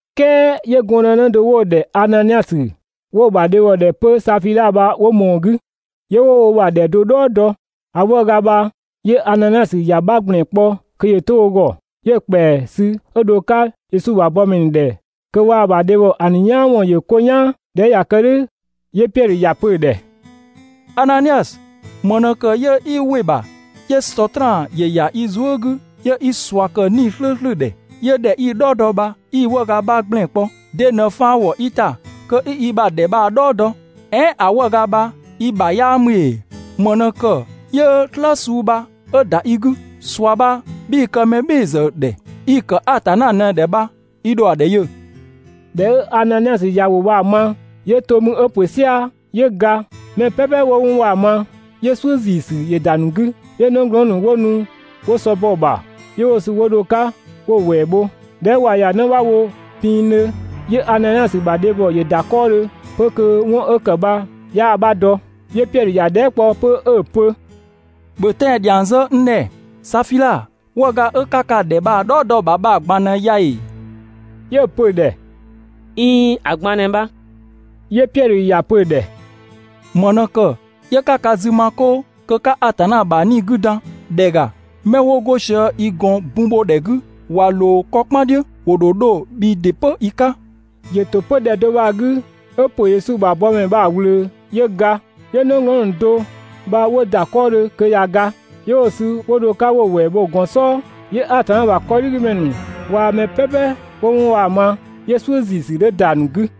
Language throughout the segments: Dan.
"Kɛɛ 'yö gɔndënë do 'wo‑ ‑dhɛ Ananiasö, 'wo‑ ‑bha dhebhɔ ‑dhɛ 'pö Safiidha bha 'wo ꞊mɔɔ‑ 'gü, 'yö 'wo wo ‑bha ‑dhɛ do "dhɔɔ dɔ. ‑A 'wëëga bha 'yö Ananiasö ‑ya 'bha ‑gblɛn kpɔ kö ‑yö 'to wo ‑gɔ, 'yö‑ ‑kpɛa sü ö dho‑ 'ka Yesu ‑bha bɔmɛ ‑nu ‑dhɛ kö waa‑ ‑bha dhebhɔ ‑a ‑nu "yaan ‑wɔn ‑yö 'ko "yaan. ꞊Dhɛ 'ö ꞊ya kë "dhʋ̈ 'yö Piɛdhö ‑ya pö‑ ‑dhɛ: «Ananiasö, ‑më ꞊në ‑kë 'yö 'i ‑wɩ ‑bha 'yö Sɔtraan ‑yö ‑ya i zuë" 'gü 'yö 'i ꞊sua ‑kë 'Nii‑ "slʋ̈ʋ̈slʋ̈ ‑dhɛ, 'yö ‑dhɛ 'i‑ "dhɔɔ dɔ bha 'i‑ 'wëëga 'bha ‑gblɛn kpɔ? De ꞊në faan ‑wɔ i ‑ta kö 'i i ‑bha ‑dhɛ bha‑ "dhɔɔ dɔ? "Ɛɛn ‑a 'wëëga bha i ‑bha 'yaa ‑mü ‑ee? ‑Më ꞊në ‑kë 'yö "slë suu bha 'ö ‑da i 'gü? ꞊Sua bha 'bhii‑ kë mɛ "bhɩɩ‑ ‑zë ‑dhɛ, i‑ ‑kë Atanna ꞊në‑ ‑dhɛ bha, (i ‑dho ‑a ‑dhɛ yö).» ꞊Dhɛ 'ö Ananiasö ‑ya ‑wʋ bha‑ ma, 'yö to 'mü 'ö ‑pö "sia‑ 'yö ga. Mɛ "pɛpɛ 'wo 'wɔn bha‑ ma, 'yö "suʋ̈ ‑ziisü ‑yö ‑da ‑nu 'gü. 'Yö 'nëglɔɔn ‑nu 'wo nu 'wo sɔ bɔ‑ ‑bha, 'yö 'wo‑ sü 'wo dho‑ 'ka 'wo‑ ‑wɛɛ bho. ꞊Dhɛ 'ö ꞊wa ‑ya 'në 'bha wo pinngdhö, 'yö Ananiasö ‑bha dhebhɔ ‑yö ‑da 'kɔɔdhö 'pö kö 'wɔn 'ö ‑kë bha 'yaa‑ 'bha dɔ. 'Yö Piɛdhö ‑ya dhɛɛ" kpɔ 'pö 'ö‑ pö: «‑Bhö tɛan‑ ‑dhiang zë n ‑dhɛ, Safiidha, 'wëëga 'ö 'ka ka ‑bha ‑dhɛ bha‑ "dhɔɔ dɔ‑ ‑bha bha‑ ꞊gban ꞊në ya ‑ee?» 'Yö‑ pö‑ ‑dhɛ: «꞊Iin, ‑a ꞊gban ꞊në bha.» 'Yö Piɛdhö ‑ya pö‑ ‑dhɛ: «‑Më ꞊në ‑kë 'yö 'ka ka zü ma 'kʋʋ kö 'ka Atanna ‑bha 'Nii‑ 'gü dan? ‑Dhɛ ‑ga, 'mɛ 'wo 'go sië i ‑gɔn bun bho ‑dhɛ 'gü ꞊wa ꞊loo 'kɔ "kpan "dhiʋ̈, ‑wo ‑dho 'dho bhii ‑dɩ 'pö i 'ka.» ‑Yö ‑to 'pö ‑dhɛ do bha‑ 'gü 'ö ‑pö Yesu ‑bha bɔmɛ bha‑ ꞊wlöö mü 'yö ga. 'Yö 'nëglɔɔn ‑nu do bha 'wo ‑da 'kɔɔdhö kö ꞊ya ga, 'yö 'wo‑ sü 'wo dho‑ 'ka 'wo‑ ‑wɛɛ bho‑ ‑bha gɔn "sɔɔ. 'Yö Atanna ‑bha 'kɔdhigümɛ ‑nu waa‑ mɛ "pɛpɛ 'wo 'wɔn bha‑ ma, 'yö "suʋ̈ ‑ziisü 'dhö ‑da ‑nu 'gü.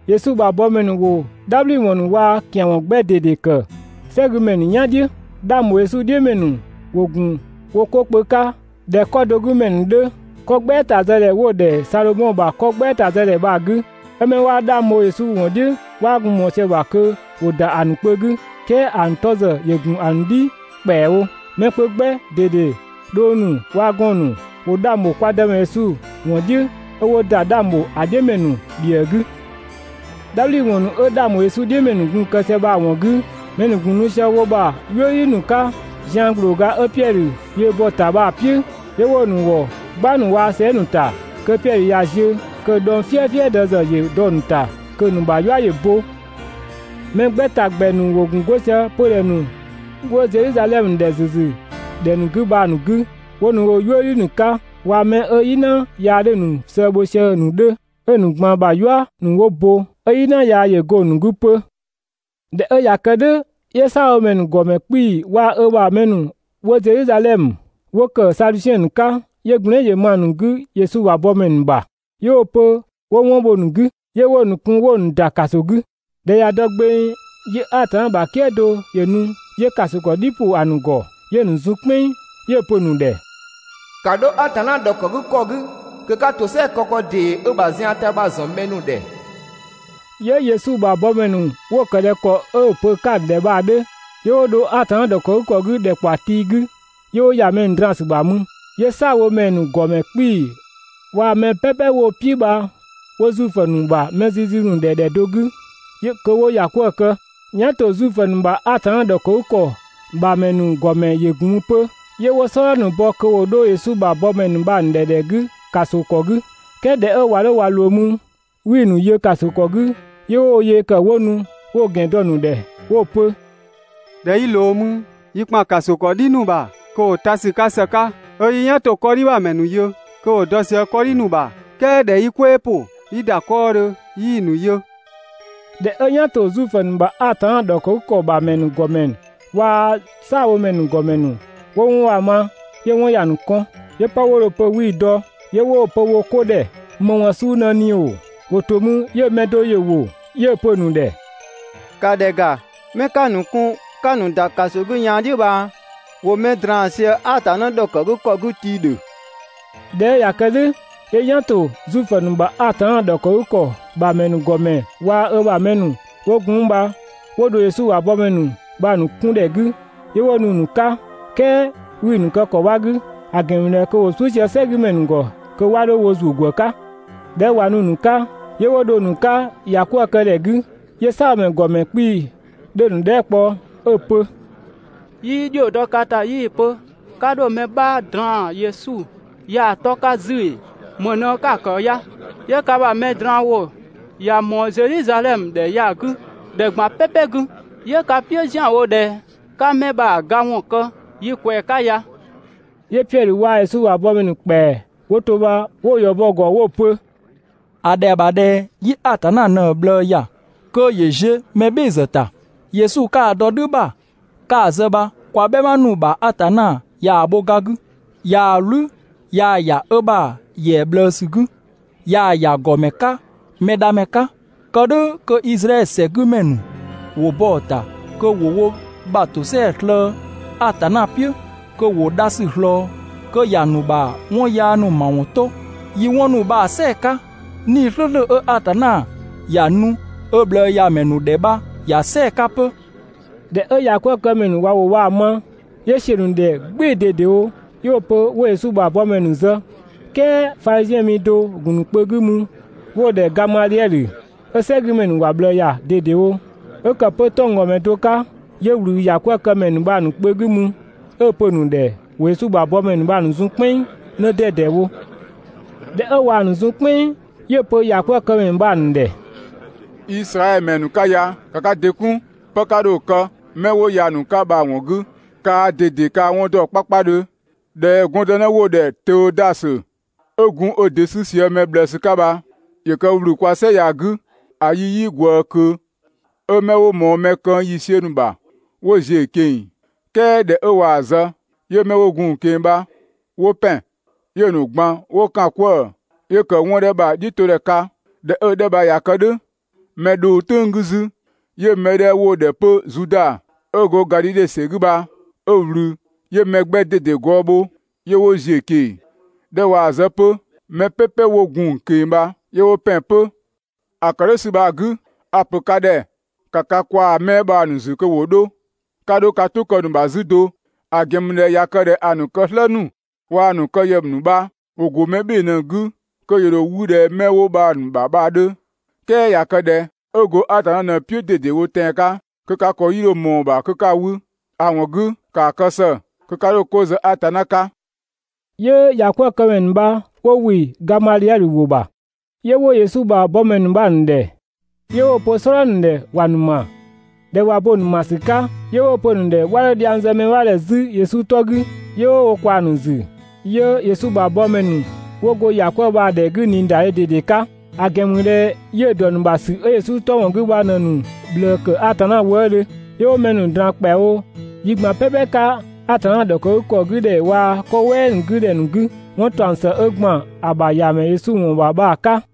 Yesu ‑bha bɔmɛ ‑nu ‑wo "dhabhliwɔn ‑nu waa‑ ‑kian ‑wɔn 'gbɛ ꞊dede ‑kë "sɛgümɛ ‑nu "yan "dhiʋ̈. 'Dhang ‑bho Yesu "dhiʋ̈ ‑mɛ ‑nu ‑wo ‑gun wo 'ko kpö 'ka ꞊dhɛ 'kɔ do 'gü ‑mɛ ‑nu 'dhö, 'kɔ "gbɛɛta zë ‑dhɛ 'wo‑ ‑dhɛ ‑dhɛ Sadhomɔ ‑bha 'kɔ "gbɛɛta zë ‑dhɛ bha‑ 'gü. 'Ö 'mɛ 'waa 'dhang bho Yesu ‑wɔn "dhiʋ̈ 'waa gun ꞊mɔɔ sië‑ ‑bha kö ‑wo ‑da ‑a ‑nu kpö 'gü, "kɛɛ ‑a ‑nu 'tɔ ‑zë ‑yö ‑gun ‑a ‑nu "dhi ‑kpɛawo. Mɛ kpö 'gbɛ ꞊dede, dhong ‑nu waa‑ gɔɔn‑ ‑nu, ‑wo 'dhang ‑bho kwa Dëmɛ Yesu ‑wɔn "dhiʋ̈, 'ö 'wo ‑da 'dhang ‑bho ‑a "dhiʋ̈ ‑mɛ ‑nu ‑bhiëë 'gü. "Dhabhliwɔn ‑nu 'ö 'dhang ‑bho Yesu "dhiʋ̈ ‑mɛ ‑nu gun‑ kë sië bha‑ ‑wɔn 'gü, mɛ ‑nu ‑gun nu sië wo ‑bha "yuëdhi ‑nu 'ka zian ‑glooga 'ö Piɛdhö ‑yö bɔ‑ ‑ta bha‑ "piʋ̈, 'yö 'wo‑ ‑nu ‑wɔ "gbang ‑nu waa‑ sɛɛ" ‑nu ‑ta kö Piɛdhö ꞊ya ziö, kö‑ dhɔng "fiëfiëdë ‑zë ‑yö dɔ‑ ‑nu ‑ta kö‑ ‑nu ‑bha "yua ‑yö bo. Mɛ 'gbɛ ‑ta ‑gbɛ ‑nu ‑wo gun 'go sië 'pödhɛ ‑nu 'wo Zedhizadhɛmö ‑dhɛ ‑züzü ‑dhɛ ‑nu 'gü bha‑ ‑nu 'gü 'wo nu woo‑ "yuëdhi ‑nu 'ka, waa‑ 'mɛ 'ö "yina yaa 'dhö‑ ‑nu sëë bho sië‑ ‑nu 'dhö, 'ö‑ ‑nu ꞊gban ‑bha "yua ‑nu 'wo bo, 'ö "yina yaa ‑yö go‑ ‑nu 'gü 'pö. ꞊Dhɛ 'ö ꞊ya kë "dhʋ̈ 'yö "saabhomɛ ‑nu ‑gɔmɛ 'kpii‑ waa‑ ö ‑bha mɛ ‑nu 'wo Zedhizadhɛmö, 'wo ‑kë Sadusiɛn ‑nu 'ka, 'yö gblɛɛn" ‑yö ma‑ ‑nu 'gü Yesu ‑bha bɔmɛ ‑nu bha‑ ‑nu ‑bha. 'Yö 'wo‑ pö 'wo 'wɔn bho‑ ‑nu 'gü. 'Yö 'wo‑ ‑nu kun 'wo‑ ‑nu ‑da ‑kaso 'gü. ꞊Dhɛ ꞊ya dɔ gbeng, 'yö Atanna ‑bha "kië do ‑yö nu 'yö ‑kaso ‑kɔ "dhi ‑pʋ ‑a ‑nu ‑gɔ, 'yö‑ ‑nu zun "kpɛnng, 'yö‑ pö‑ ‑nu ‑dhɛ: «‑Ka 'dho Atanna ‑dhɔkëgükɔ 'gü kö 'ka ‑tosɛa kë ‑kɔ ‑dee 'ö‑ ‑bha zian ‑ta bha‑ ‑zɔn mɛ ‑nu ‑dhɛ!» 'Yö Yesu ‑bha bɔmɛ ‑nu 'wo‑ ‑kë ꞊dhɛ ‑kɔ 'ö‑ pö‑ 'ka‑ ‑nu ‑dhɛ bha‑ 'dhö. 'Yö 'wo dho Atanna ‑dhɔkëgükɔ 'gü ‑dhɛkpaɔ tii 'gü, 'yö 'wo ‑ya mɛ draan‑ ‑sü ‑bha mü. 'Yö "saabhomɛ ‑nu ‑gɔmɛ 'kpii‑ waa‑ mɛ "pɛpɛ 'wo‑ "piʋ̈ bha 'wo Zuifö ‑nu ‑bha mɛ zizi ‑nu ‑dhɛ ‑dhɛ do 'gü kö 'wo ‑ya 'kwëë‑ kë. ("Yan ‑to Zuifö ‑nu ‑bha Atanna ‑dhɔkëgükɔ ‑bha ‑mɛ ‑nu ‑gɔmɛ ‑yö ‑gun mü 'pö). 'Yö 'wo "sɔdha ‑nu bɔ kö ‑wo 'dho Yesu ‑bha bɔmɛ ‑nu bha‑ ‑nu ‑dhɛ ‑dhɛ 'gü ‑kaso ‑kɔ 'gü. "Kɛɛ ꞊dhɛ 'ö ꞊wa 'dho ꞊wa ꞊loo mü, 'wii‑ ‑nu yö ‑kaso ‑kɔ 'gü, 'yö 'wo wo yee ‑kë 'wo nu 'wo‑ ‑gɛn dɔ‑ ‑nu ‑dhɛ 'wo‑ pö: «꞊Dhɛ 'yi ꞊loo mü, yi ‑kpan ‑kaso ‑kɔ "dhi ‑nu ‑bha kö ‑wo ta ‑sü 'ka ‑së 'ka, 'ö 'yi "yan ‑to 'kɔdhi ‑bha ‑mɛ ‑nu yö kö ‑wo dɔ sië 'kɔdhi ‑nu ‑bha, "kɛɛ ꞊dhɛ 'yi "kwɛɛ ‑pʋ 'yi ‑da 'kɔɔdhö 'yii‑ ‑nu yö.» ꞊Dhɛ 'ö "yan ‑to Zuifö ‑nu ‑bha Atanna ‑dhɔkëgükɔ ‑bha mɛ ‑nu ‑gɔmɛ waa‑ "saabhomɛ ‑nu ‑gɔmɛ ‑nu 'wo 'wɔn bha‑ ma, 'yö‑ 'wɔn ‑ya ‑nu kɔn, 'yö 'pë 'wo dho‑ pö 'wii‑ dɔ, 'yö 'wo‑ pö wo 'ko ‑dhɛ: «‑Më ‑wɔn suu ꞊në ꞊ni ‑oo?» ‑Wo ‑to mü 'yö mɛ do ‑yö ‑wo, 'yö‑ pö‑ ‑nu ‑dhɛ: «‑Ka ‑dhɛ ‑ga, 'mɛ 'ka‑ ‑nu kun 'ka‑ ‑nu ‑da ‑kaso 'gü yaan "dhiʋ̈ bha, ‑wo mɛ draan‑ sië Atanna ‑dhɔkëgükɔ 'gü tii‑ ‑dhö.» ꞊Dhɛ 'ö ꞊ya kë "dhʋ̈, 'yö "yan ‑to Zuifö ‑nu ‑bha Atanna ‑dhɔkëgükɔ ‑bha ‑mɛ ‑nu ‑gɔmɛ waa‑ ö ‑bha mɛ ‑nu 'wo gun 'mü bha 'wo dho Yesu ‑bha bɔmɛ ‑nu bha‑ ‑nu 'kun ‑dhɛ 'gü, 'yö 'wo nu‑ ‑nu 'ka, "kɛɛ 'wii‑ ‑nu kë ‑kɔ 'bha 'gü, ‑a ‑gɛn ‑mü ꞊dhɛ kö ‑wo "suʋ̈ sië "sɛgümɛ ‑nu ‑gɔ kö 'wa 'dho wo ‑zuö ‑gwë 'ka. ꞊Dhɛ 'ö ꞊wa nu‑ ‑nu 'ka, 'yö 'wo dho‑ ‑nu 'ka ‑ya 'kwëë‑ këdhɛ 'gü, 'yö "saabhomɛ ‑nu ‑gɔmɛ 'kpii‑ 'dhö‑ ‑nu dhɛɛ" kpɔ 'ö‑ pö: «'Yii ‑dhio dɔ ka ‑ta 'yii‑ pö 'ka 'dho mɛ 'bha draan‑ Yesu ya‑ 'tɔ 'ka 'zü ‑ee? ‑Më ꞊në 'ka‑ ‑kë ya? 'Yö ka ‑bha mɛ draan‑ ‑wʋ ꞊ya ꞊mɔɔ Zedhizadhɛmö ‑dhɛ ya‑ 'gü ‑dhɛ ꞊gban "pɛpɛ 'gü, 'yö ka "piʋ̈ ‑zianwo ꞊dhɛ 'ka 'mɛ bha‑ ga ‑wɔn kë yi ꞊kwɛɛ‑ 'ka ya.» 'Yö Piɛdhö waa‑ Yesu ‑bha bɔmɛ ‑nu ‑kpɛa 'wo to bha 'wo‑ ‑yɔ bɔ‑ ‑gɔ 'wo‑ pö: «‑A ‑dhɛa ‑bha ꞊dhɛ 'yi Atanna ꞊në‑ ꞊bhlëë ‑ya kö ‑yö ziö‑ mɛ "bhɩɩ‑ ‑zë ‑bha ‑ta! Yesu 'ka‑ dɔ "dhü ‑bha 'ka‑ zë bha kwa "bhɛma ‑nu ‑bha Atanna ꞊yaa‑ bho ga 'gü, ꞊yaa‑ "wlü ꞊yaa‑ ‑ya ö ‑bha ‑yɛa ꞊bhlëësü 'gü, ꞊yaa‑ ‑ya ‑gɔmɛ 'ka Mɛdhamɛ 'ka, kë "dhʋ̈ kö Izraɛdhö ‑sɛgümɛ ‑nu ‑wo bɔ‑ ‑ta kö ‑wo wo ‑bha ‑tosɛadhe slëë‑ Atanna "piʋ̈ kö ‑wo dha ‑sü ꞊slɔɔ, kö ‑ya ‑nu ‑bha 'wɔn yaa ‑nu ‑mawɔn 'to. Yi 'wɔn ‑nu bha‑ "sɛɛ‑ 'ka, 'Nii‑ "slʋ̈ʋ̈slʋ̈ 'ö Atanna ‑ya nu ö ꞊bhlëëyamɛ ‑nu ‑dhɛ bha ‑ya "sɛɛ‑ 'ka 'pö.» ꞊Dhɛ 'ö ‑yakwëëkëmɛ ‑nu ꞊wa ‑wʋ bha‑ ma, 'yö ‑siö ‑nu ‑dhɛ "gbɩɩ‑ ꞊dedewo, 'yö 'wo‑ pö 'wo Yesu ‑bha bɔmɛ ‑nu zë. "Kɛɛ Fadhiziɛn mi do‑ gun‑ ‑nu kpö 'gü mü, 'wo‑ ‑dhɛ Gamadhiɛdhö, 'ö "sɛgümɛ ‑nu ‑wa ꞊bhlëë ‑ya ꞊dedewo, 'ö kë 'pö 'tɔnggɔmɛ do 'ka, 'yö ꞊wlü ‑yakwëëkëmɛ ‑nu bha‑ ‑nu kpö 'gü mü 'ö‑ pö‑ ‑nu ‑dhɛ ‑wo Yesu ‑bha bɔmɛ ‑nu bha‑ ‑nu zun "kpɛnng 'në 'dɛdɛ wo. ꞊Dhɛ 'ö ꞊waa‑ ‑nu zun "kpɛnng, 'yö‑ pö ‑yakwëëkëmɛ ‑nu bha‑ ‑nu ‑dhɛ: «Izraɛdhö ‑mɛ ‑nu 'ka ya, ‑ka ka ‑dɩ 'kun 'pë 'ka dho‑ kë 'mɛ 'wo ya‑ ‑nu 'ka bha‑ ‑wɔn 'gü! Kaa ꞊dede ka‑ 'wɔn ‑dɔ 'kpakpadhö ꞊dhɛ gɔndënë 'wo‑ ‑dhɛ Tëüdasö, 'ö gun ö ‑dɩ 'sü sië mɛ ꞊bhlëësü 'ka bha ‑yö kë ‑wlü kwaa‑ "sɛ ya‑ 'gü ‑a yi 'yii ꞊gwëë ꞊kö, 'ö 'mɛ 'wo ꞊mɔɔ mɛ këng ‑yiisiö ‑nu ‑bha 'wo ‑ziö ꞊keng‑, "kɛɛ ꞊dhɛ 'ö ꞊waa‑ zë, 'yö 'mɛ 'wo gun‑ ꞊keng‑ bha 'wo ‑pɛn, 'yö‑ ‑nu ꞊gban 'wo ‑kan 'kwëë‑, 'yö ‑kë 'wɔn 'dhɛ bha‑ "dhiʋ̈todhɛ 'ka. ꞊Dhɛ 'ö‑ 'dhɛ bha ꞊ya kë "dhʋ̈, mɛ dhʋng "tʋ̈ng 'gü 'zü, 'yö 'mɛ 'dhɛ 'wo‑ ‑dhɛ 'pö Zuda 'ö go Gadhidhe ‑sɛ 'gü bha 'ö ꞊wlü. 'Yö mɛ 'gbɛ ꞊dede gɔɔ bho 'yö 'wo ‑ziö ꞊keng‑. ꞊Dhɛ 'ö ꞊waa‑ zë 'pö, mɛ "pɛpɛ 'wo gun‑ ꞊keng‑ bha 'yö 'wo ‑pɛn 'pö. ‑A ‑kë "dhʋ̈ ‑sü bha‑ 'gü, a‑ ‑pö ka ‑dhɛ: ‑Ka ka kwaa‑ 'mɛ bha‑ ‑nu ‑zü kö ‑wo 'dho, 'ka 'dho ka "tʋ kë‑ ‑nu ‑bha 'zü do. ‑A ‑gɛn ‑mü ꞊dhɛ ꞊ya kë ꞊dhɛ ‑a ‑nu kë "slë ‑nu waa‑ ‑nu kë ‑yë ‑nu bha ‑wo ‑go mɛ "bhɩɩ‑ ꞊në‑ 'gü, kö ‑yö ‑dho 'wü ꞊dhɛ 'mɛ 'wo bha‑ ‑nu ‑bha bha‑ 'dhö, "kɛɛ ꞊ya kë ꞊dhɛ 'ö ‑go Atanna ꞊në‑ "piʋ̈ ꞊dedewo tɛan‑ 'ka, kö ka ‑kɔ 'yii 'dho ꞊mɔɔ‑ ‑bha kö 'ka‑ 'wü. ‑A ‑wɔn 'gü ‑kaa kë ‑së kö 'ka 'dho 'ko zë Atanna 'ka!» 'Yö ‑ya 'kwëë‑ këmɛ ‑nu bha 'wo ‑wɩ Gamadhiɛdhö ‑wʋ ‑bha. 'Yö 'wo Yesu ‑bha bɔmɛ ‑nu bha‑ ‑nu ‑dhɛ, 'yö 'wo‑ pö "sɔdha ‑nu ‑dhɛ ‑wa ‑nu ‑ma. ꞊Dhɛ ꞊wa bo‑ ‑nu ‑ma ‑sü 'ka, 'yö 'wo‑ pö‑ ‑nu ‑dhɛ 'wa 'dho dhiang zë mɛ 'bha ‑dhɛ 'zü Yesu 'tɔ 'gü, 'yö 'wo wo ꞊kwaa‑ ‑nu ‑zü. 'Yö Yesu ‑bha bɔmɛ ‑nu 'wo go ‑ya 'kwëë‑ bha‑ ‑dhɛ 'gü ꞊niidadhe ꞊dede 'ka, ‑a ‑gɛn ‑mü ꞊dhɛ 'yiʋ̈‑ ‑dɔ ‑nu ‑bha ‑sü 'ö Yesu 'tɔ ‑wɔn 'gü bha ꞊në‑ ‑nu ꞊bhlëë ‑kë Atanna wëëdhö. 'Yö 'wo mɛ ‑nu ꞊draan ‑kpɛawo yi ꞊gban "pɛpɛ 'ka Atanna ‑dhɔkëgükɔ 'gü ‑dhɛ waa‑ 'kɔ "wɛɛ 'gü ‑dhɛ ‑nu 'gü 'wɔn ‑taɔng ‑së 'ö ‑gban ‑a ‑bha ‑Yamɛ Yesu ‑wɔn ‑bha bha‑ 'ka.